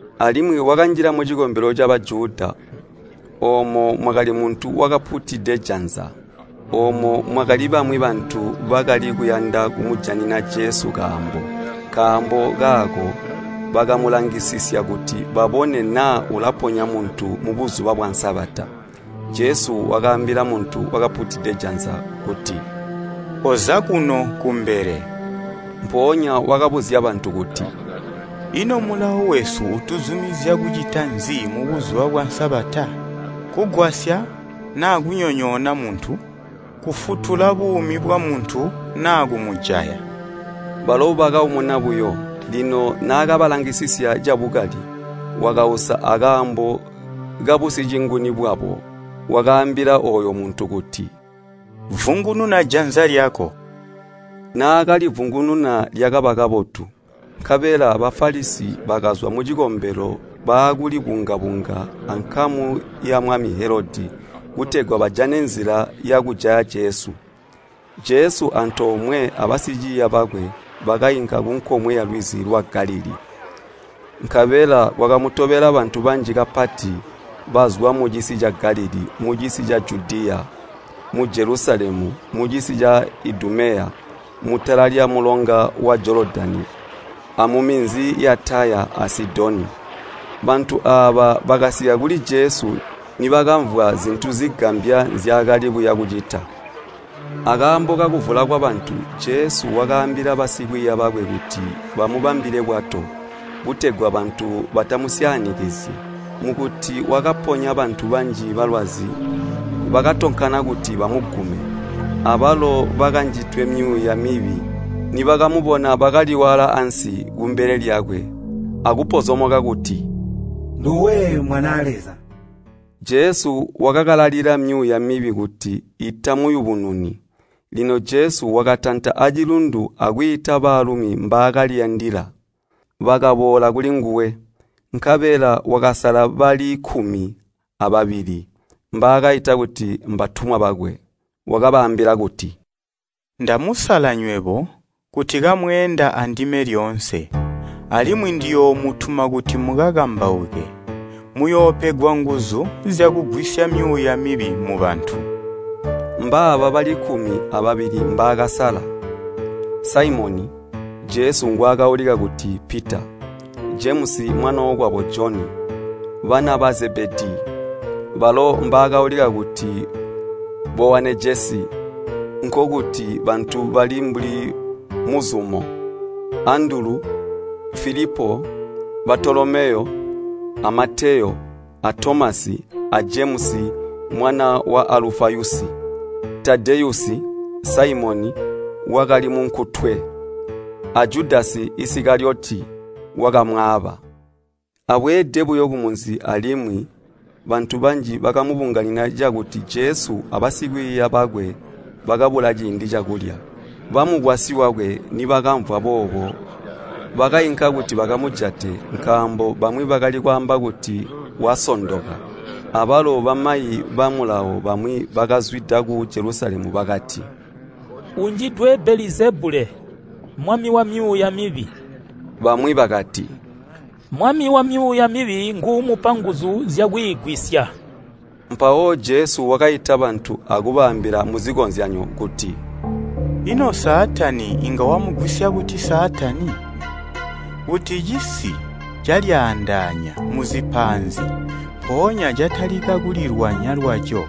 Alimwi wakanjila mucikombelo ca Bajuda, oomo mwakali muntu wakapuutide janza. Oomo mwakali bamwi bantu bakali kuyanda kumujanina Jesu kaambo, nkaambo kaako bakamulangisisya kuti babone naa ulaponya muntu mu Buzuba bwa Kulyookezya butegwa Sabata. Jesu wakaambila muntu wakapuutide janza kuti, “Koza kuno kumbele.” Mpoonya wakabuzya bantu kuti, “Ino Mulawo wesu utuzumizya kucita nzi mu Buzuba bwa Sabata? Kugwasya naa kunyonyoona muntu? Kufutula buumi bwamuntu, naa kumujaya?” Balo bakaumuna buyo. Lino naakabalangisisya cabukali, wakausa akaambo kabusicinguni bwabo, wakaambila ooyo muntu kuti, “Vungununa janza lyako.” Naakalivungununa lyakaba kabotu. Nkabela Bafalisi bakazwa mucikombelo baakuli bunga-bunga abankamu yamwami Helodi kutegwa bajane nzila yakujaya Jesu. Jesu antoomwe abasikwiiya bakwe bakainka kunkomwe yalwizi lwa Galilii. Nkabela kwakamutobela bantu banji kapati, bazwa mucisi ca Galilii, mucisi ca Judiya, mu Jelusalemu, mucisi ca Idumeya, mutala lyamulonga wa Jolodani amuminzi ya Taya a Sidoni. Bantu aaba bakasika kuli Jesu nibakamvwa zintu zigambya nzyaakali buya bucita. Akaambo kakuvula kwabantu, Jesu wakaambila basikwiiya bakwe kuti bamubambile bwato, kutegwa bantu batamusyaanikizyi. Mukuti wakaponya bantu banji balwazi bakatonkana kuti bamugume. Abalo bakanjidwe myuuya mibi nibakamubona bakaliwaala ansi kumbele lyakwe akupozomoka kuti, “Nduwe Mwanaa Leza.” Jesu wakakalalila myuuya mibi kuti itamuyubununi. Lino Jesu wakatanta acilundu akwiita baalumi mbaakaliyandila. Bakaboola kulinguwe, nkabela wakasala bali kkumi ababili, mbaakaita kuti mbatumwa bakwe. Wakabaambila kuti, “Ndamusala nywebo kuti kamweenda andime lyoonse, alimwi ndiyoomutuma kuti mukakambauke. Muyoopegwa nguzu zyakugwisya myuuya mibi mubantu.” Mbaaba bali kkumi ababili mbaakasala: Saimoni, (Jesu ngwaakaulika kuti Pita), Jemusi mwanookwabo Joni, bana ba Zebedii (balo mbaakaulika kuti Bowanejesi, nkokuti bantu bali mbuli muzumo), Andulu, Filipo, Baatolomeyo, a Mateyo, a Tomasi, a Jemusi, mwana wa Alufayusi, Tadeyusi, Saimoni, wakali munkutwe, a Judasi Isikaliyoti, wakamwaaba. Abweede buyo kumunzi alimwi, bantu banji bakamubunganina cakuti Jesu abasikwiiya bakwe bakabula ciindi cakulya. Bamukwasyi wakwe nibakamvwa boobo bakainka kuti bakamujate, nkaambo bamwi bakali kwaamba kuti, “Wasondoka!” Abalo bamayi ba Mulawo bamwi bakazwida ku Jelusalemu bakati, “Unjidwe Belizebule, mwami wamyuuya mibi!” Bamwi bakati, “Mwami wamyuuya mibi nguumupa nguzu zyakwiigwisya.” Mpawo Jesu wakaita bantu akubaambila muzikozyanyo kuti, “Ino Saatani inga wamugwisya buti Saatani? Kuti cisi calyaandaanya muzipaanzi mpoonya catalika kulilwanya lwaco,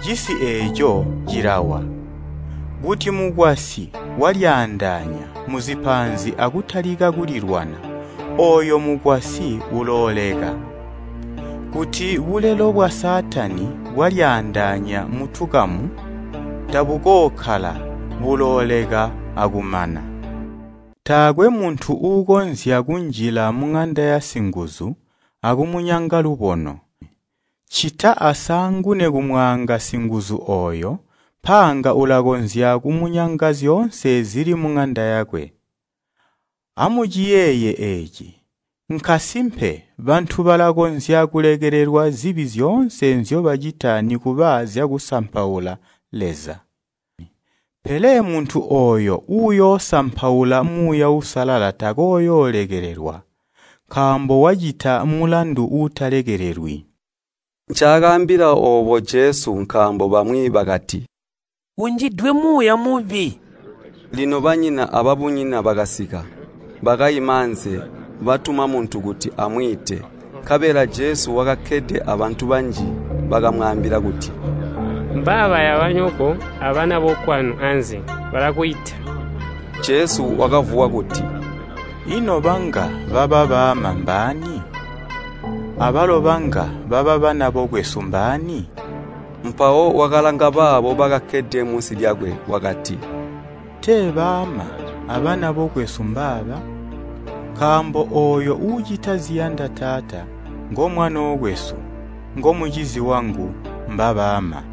cisi eeco, cilawa. Kuti mukwasyi walyaandaanya muzipaanzi akutalika kulilwana, ooyo mukwasyi ulooleka. Kuti bulelo bwa Saatani bwalyaandaanya mutukamu, tabukookkala, bulooleka akumana. “Taakwe muntu uukonzya kunjila muŋanda yasinguzu akumunyanga lubono, ccita asaangune kumwaanga singuzu ooyo, mpaanga ulakonzya kumunyanga zyoonse zili muŋanda yakwe. “Amuciyeeye eeci! Nkasimpe bantu balakonzya kulekelelwa zibi zyoonse nzyobacita nikuba zyakusampaula Leza. Pele muntu ooyo uyoosampaula Muuya Uusalala takooyoolekelelwa, nkaambo wacita mulandu uutalekelelwi.” Ncaakambila oobo Jesu nkaambo bamwi bakati, “Unjidwe muuya mubi.” Lino banyina ababunyina bakasika. Bakaima anze, batuma muntu kuti amwiite. Nkabela Jesu wakakkede abantu banji bakamwaambila kuti, “Mbabaya banyoko abanabokwanu anze, balakwiita.” Jesu wakavuwa kuti, “Ino banga baba baama mbaani? Abalo banga baba banabokwesu mbaani?” Mpawo wakalanga baabo bakakkede munsi lyakwe wakati, “Tee baama abana bokwesu mbaaba! Nkaambo ooyo uucita ziyanda Taata ngomwanookwesu, ngomucizi wangu, mbabaama.”